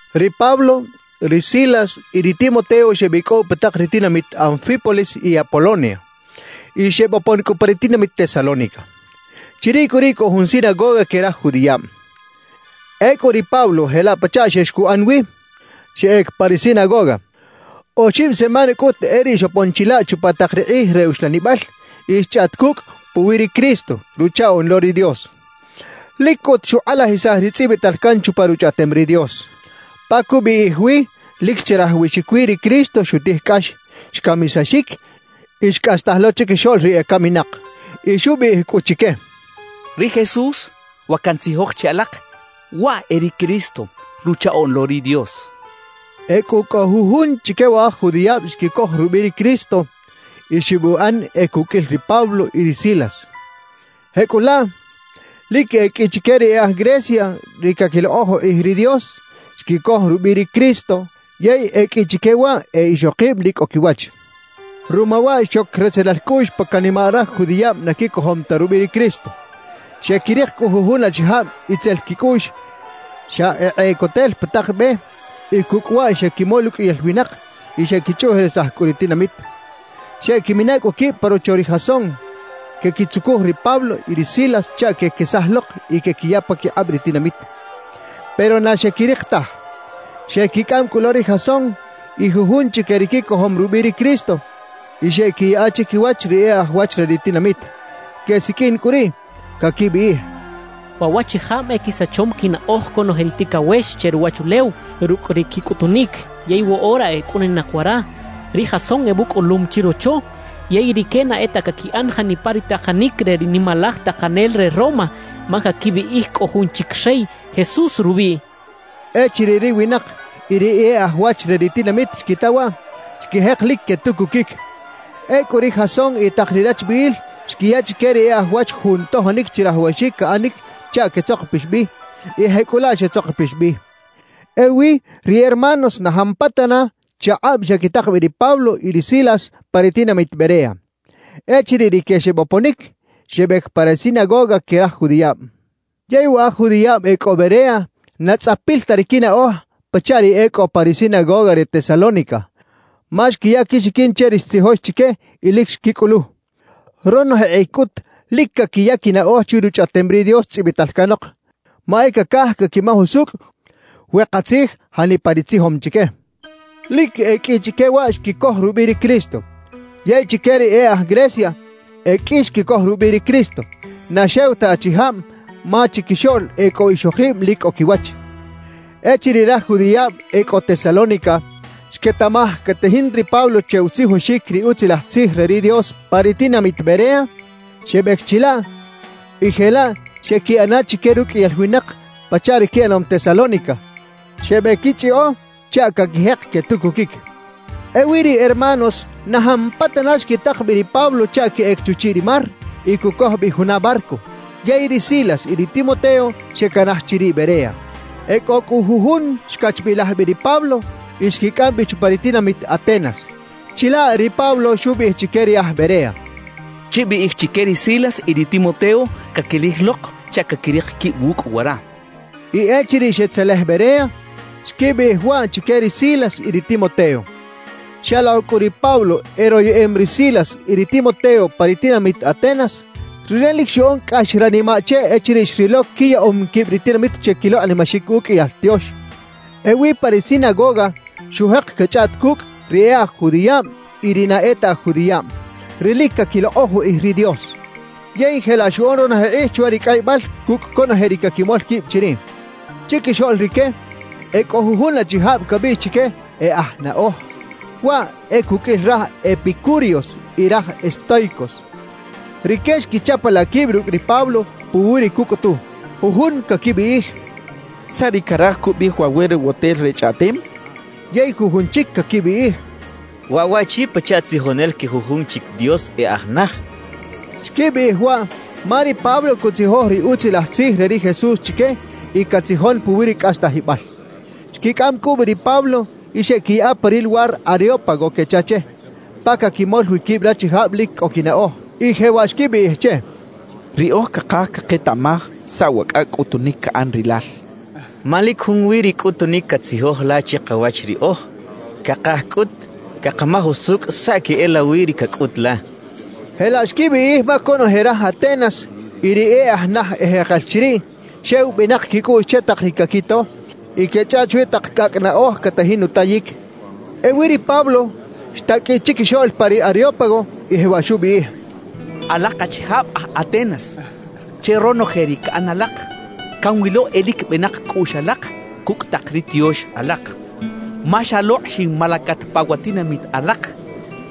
Ri Pablo, ri Silas y ri Timoteo xebicꞌow pa tak ri tinamit Anfípolis y Apolonia, y xebopon cꞌu pa ri tinamit Tesalónica. Chiriꞌ cꞌu riꞌ cꞌo jun sinagoga que raj judiꞌab. Ecꞌu ri Pablo jelaꞌ pachaꞌ xex cuꞌan wi, xeꞌec pa ri sinagoga; oxib semana cꞌut e riꞌ xopon chilaꞌ chupa tak ri kꞌij re uxlanibal y xchꞌaꞌt cucꞌ puwi ri Cristo, Ruchaꞌoꞌn lo ri Dios. Lic cꞌut xukꞌalajisaj ri tzꞌibital can chupa Ruchꞌaꞌtem ri Dios pa cubiꞌij wi lic chirajawaxic wi ri Cristo xutij cꞌax, xcamisaxic y xcꞌastaj lo chiquixoꞌl ri ecaminak. Y xubiꞌij cꞌu chique: «Ri Jesús, wa cantzijoj che alak, waꞌ e ri Cristo, Ruchaꞌoꞌn lo ri Dios» xchaꞌ. E cꞌo cꞌu jujun chique wa aj judiꞌab xquicoj rubiꞌ ri Cristo y xebuꞌan e cuqꞌuil ri Pablo y ri Silas. Jecꞌulaꞌ, lic e qꞌui chique ri e aj Grecia ri caquilokꞌoj ukꞌij ri Dios, xquicoj rubiꞌ ri Cristo; yey e qꞌui chique waꞌ e ixokib lic cꞌo quiwach. Ruma waꞌ xoc retzelal cꞌuꞌx pa canimaꞌ raj judiꞌab na quicojom ta rubiꞌ ri Cristo. Xequirik cꞌu jujun achijab itzel quicꞌuꞌx xa ekꞌeꞌcotel pa tak be, y cucꞌ waꞌ xequimol uqꞌuiyal winak y xequichꞌuꞌjerisaj cꞌu ri tinamit. Xeꞌquimina cꞌu quib pa rocho ri Jasón, quequitzucuj ri Pablo y ri Silas chaꞌ quequesaj lok y quequiya paquikꞌab ri tinamit. Pero na xequirik taj. Xequicꞌam cꞌu lo ri Jasón y jujun chique ri quicojom rubiꞌ ri Cristo, y xeꞌquiyaꞌa chiquiwach ri e aj wach re ri tinamit. Quesiqꞌuin cꞌu riꞌ, caquibiꞌij: «¡Waꞌ waꞌchijab e quisachom quinaꞌoj conoje ri ticawex che ruwachulew rucꞌ ri quicꞌutunic, yey woꞌora e cꞌuninak wara! Ri Jasón ebucꞌulum chirocho. Yey rique na e ta caquiꞌan janipa ri takanic re ri nimalaj takanel re Roma, ma caquibiꞌij cꞌo jun chic rey, Jesús rubiꞌ» quechaꞌ. Echiriꞌ ri winak y ri e aj wach re ri tinamit xquita waꞌ, xquijek lic quetucuquic. Ecꞌu ri Jasón y tak ri rachbiꞌil xquiya chique ri e aj wach jun tojonic chirajawaxic caꞌanic chaꞌ quetzokopix bi, y jecꞌulaꞌ xetzokopix bi. Ewi ri hermanos na jampatana chakꞌab xequitak bi ri Pablo y ri Silas pa ri tinamit Berea. Echiriꞌ rique xeboponic, xebec pa ri sinagoga que raj judiꞌab. Yey wa aj judiꞌab e cꞌo Berea na tzꞌapil ta ri quinaꞌoj pachaꞌ ri e cꞌo pa ri sinagoga re Tesalónica, ma xquiya quixiquin che ri xtzijox chique y lic xquicꞌulu. Ronoje kꞌij cꞌut lic caquiya quinaꞌoj chwi Ruchꞌaꞌtem ri Dios tzꞌibital canok, ma e cacaj caquimaj usucꞌ we katzij janipa ri tzijom chique. Lic e qꞌui chique waꞌ xquicoj rubiꞌ ri Cristo. Yey chique ri e aj Grecia, e qꞌui xquicoj rubiꞌ ri Cristo, na xew ta achijab ma chiquixoꞌl e cꞌo ixokib lic cꞌo quiwach. Echiriꞌ raj judiꞌab e cꞌo Tesalónica xquetaꞌmaj catajin ri Pablo che utzijoxic ri Utzilaj Tzij re ri Dios pa ri tinamit Berea, xebec chilaꞌ y jelaꞌ xeꞌquiꞌana chique ruqꞌuiyal winak pachaꞌ ri quiꞌanom Tesalónica, xebequichꞌiꞌo chaꞌ caquijek quetucuquic. Ewi ri hermanos na jampatana xquitak bi ri Pablo chaꞌ queꞌec chuchiꞌ ri mar y cucoj bi juna barco; yey ri Silas y ri Timoteo xecanaj chiriꞌ Berea. E cꞌo cꞌu jujun xcachbilaj bi ri Pablo y xquicꞌam bi chupa ri tinamit Atenas. Chilaꞌ ri Pablo xubiꞌij chique ri aj Berea: «Chibiꞌij chique ri Silas y ri Timoteo caquilij lok chaꞌ caquirik quib wucꞌ wara.» Y echiriꞌ xetzelej Berea, xquibiꞌij waꞌ chique ri Silas y ri Timoteo. Xalokꞌ cꞌu ri Pablo eroyeꞌem ri Silas y ri Timoteo pa ri tinamit Atenas, rire lic xuꞌan cꞌax ranimaꞌ che echiriꞌ xrilo quiyaꞌom quib ri tinamit che quilokꞌnimaxic uqꞌuiyal tiox. Ewi pa ri sinagoga xujek cachꞌaꞌt cucꞌ ri e aj judiꞌab y ri na e ta aj judiꞌab, ri lic caquilokꞌoj ukꞌij ri Dios. Yey jelaꞌ xuꞌan ronoje kꞌij chwa ri cꞌaybal cucꞌ conoje ri caquimol quib chiriꞌ. Chiquixoꞌl rique e cꞌo jujun achijab cabiꞌx chique “e aj naꞌoj”, waꞌ e cuqꞌuil raj epicúreos y raj estóicos. Rique xquichapalaꞌ quib rucꞌ ri Pablo puwi ri cucꞌutu. Jujun caquibiꞌij: «¿Saꞌ ri caraj cubiꞌij wa werewotel re chꞌaꞌtem?» quechaꞌ. Yey jujun chic caquibiꞌij: «Waꞌ waꞌchi pachaꞌ tzijonel que jujun chic dios e aj naj» quechaꞌ. Xquibiꞌij waꞌ ma ri Pablo cutzijoj ri Utzilaj Tzij re ri Jesús chique y catzijon puwi ri cꞌastajibal. Xquicꞌam cꞌu bi ri Pablo y xeꞌquiyaꞌa pa ri luwar Areópago quecha che, pa caquimol wi quib rachijab lic cꞌo quinaꞌoj. Y jewaꞌ xquibiꞌij che: «Riꞌoj cakaj caketaꞌmaj saꞌ wa cꞌacꞌ cꞌutunic caꞌan rilal, ma lic junwi ri cꞌutunic catzijoj la chikawach riꞌoj. Cakaj cꞌut cakamaj usucꞌ saꞌ queꞌelawi ri cacꞌut la» xechaꞌ. Jelaꞌ xquibiꞌij ma conoje raj Atenas y ri e aj naj ejekel chiriꞌ, xew benak quicꞌuꞌx che tak ri caquito y quechꞌaꞌt chwi tak cꞌacꞌ naꞌoj catajin utayic. Ewi ri Pablo, xtaqꞌuiꞌ chiquixoꞌl pa ri Areópago y jewaꞌ xubiꞌij: «Alak achijab aj Atenas, che ronoje ri caꞌan alak, canwilo e lic benak cꞌuꞌx alak cucꞌ tak ri tiox alak. Ma xalokꞌ xinmalacat pa wa tinamit alak,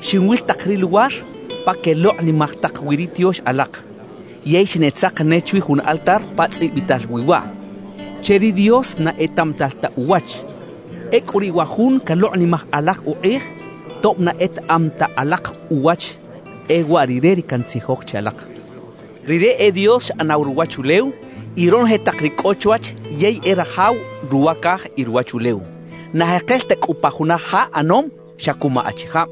xinwil tak ri luwar pa quelokꞌnimaj tak wi ri tiox alak, yey xineꞌtzak ne chwi jun altar pa tzꞌibital wi waꞌ: «CHE RI DIOS NA ETAꞌMATAL TA UWACH.» Ecꞌu riꞌ wa jun calokꞌnimaj alak ukꞌij tob na etaꞌam ta alak uwach, e waꞌ Rire ri cantzijoj che alak. Rire e Dios xꞌanaw ruwachulew y ronoje tak ri cꞌo chwach yey e Rajaw ruwa caj y ruwachulew. Na jekel ta cꞌu pa juna ja ꞌanom xa cuma achijab.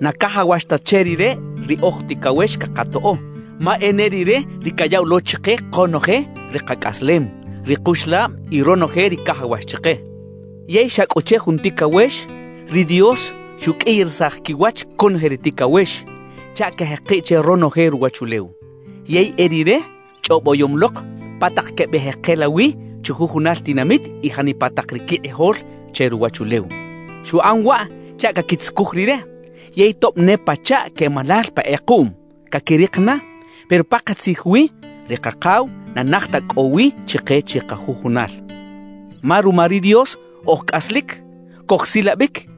Na cajawax ta che Rire ri oj ticawex cakatoꞌo; ma e ne Rire ri cayaꞌw lo chike konoje ri kacꞌaslem, ri kuxlab y ronoje ri cajawax chike. »Yey xa cꞌu che jun ticawex, ri Dios xuqꞌuiyarisaj quiwach conoje ri ticawex chaꞌ quejekiꞌ che ronoje ruwachulew. Yey e Rire chꞌoboyom lok pa tak quebeꞌjekela wi chujujunal tinamit y janipa tak ri quikꞌijol che ruwachulew. Xuꞌan waꞌ chaꞌ caquitzucuj Rire, yey tob ne pachaꞌ quemalal pa kꞌekuꞌm, caquirik na. Pero pakatzij wi, ri Kakaw na naj ta cꞌo wi chike chikajujunal. Ma ruma ri Dios oj cꞌaslic, cojsilabic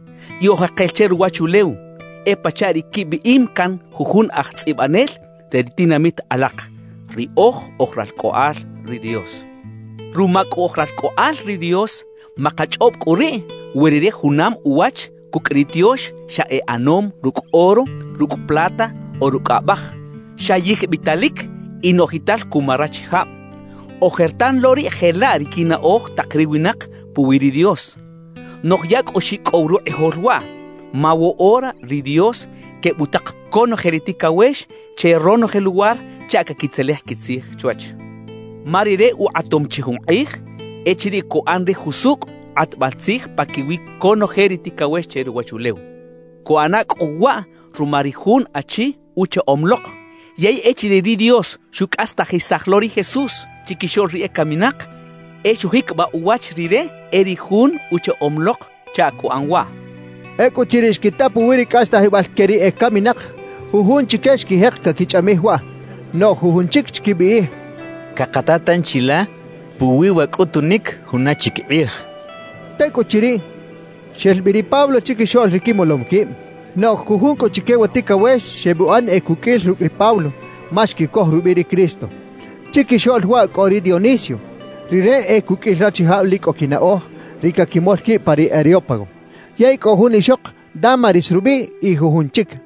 y oj jekel che ruwachulew; e pachaꞌ ri quibiꞌim can jujun aj tzꞌibanel re ri tinamit alak: “Riꞌoj oj ralcꞌoꞌal ri Dios.” »Ruma cꞌu oj ralcꞌoꞌal ri Dios, makachꞌob cꞌu riꞌ we Rire junam uwach cucꞌ ri tiox xa e ꞌanom rucꞌ oro, rucꞌ plata o rucꞌ abaj, xa yijbitalic y noꞌjital cuma rachijab. Ojertan lo riꞌ jelaꞌ ri quinaꞌoj tak ri winak puwi ri Dios, noꞌj ya cꞌu xicꞌow rukꞌijol waꞌ. Ma woꞌora ri Dios quebutak conoje ri ticawex che ronoje luwar chaꞌ caquitzelej quitzij chwach. Ma Rire ukꞌatom chi jun kꞌij echiriꞌ cuꞌan ri jusucꞌ kꞌatbal tzij paquiwi conoje ri ticawex che ruwachulew. Cuꞌana cꞌu waꞌ ruma ri Jun Achi Uchaꞌom lok. Yey echiriꞌ ri Dios xucꞌastajisaj lo ri Jesús chiquixoꞌl ri ecaminak, e xujiquibaꞌ uwach Rire e ri Jun uchaꞌom lok chaꞌ cuꞌan waꞌ» xchaꞌ. Ecꞌuchiriꞌ xquita puwi ri cꞌastajibal que ri ecaminak, jujun chique xquijek caquichꞌamij waꞌ. Noꞌj jujun chic xquibiꞌij: «Cakata tanchi la puwi wa cꞌutunic juna chic kꞌij» xechaꞌ. Tecꞌuchiriꞌ, xel bi ri Pablo chiquixoꞌl ri quimolom quib. Noꞌj jujun cꞌu chique wa ticawex xebuꞌan e cuqꞌuil rucꞌ ri Pablo, ma xquicoj rubiꞌ ri Cristo. Chiquixoꞌl waꞌ cꞌo ri Dionisio (rire e cuqꞌuil rachijab lic cꞌo quinaꞌoj, ri caquimol quib pa ri Areópago), yey cꞌo jun ixok Dámaris rubiꞌ y jujun chic.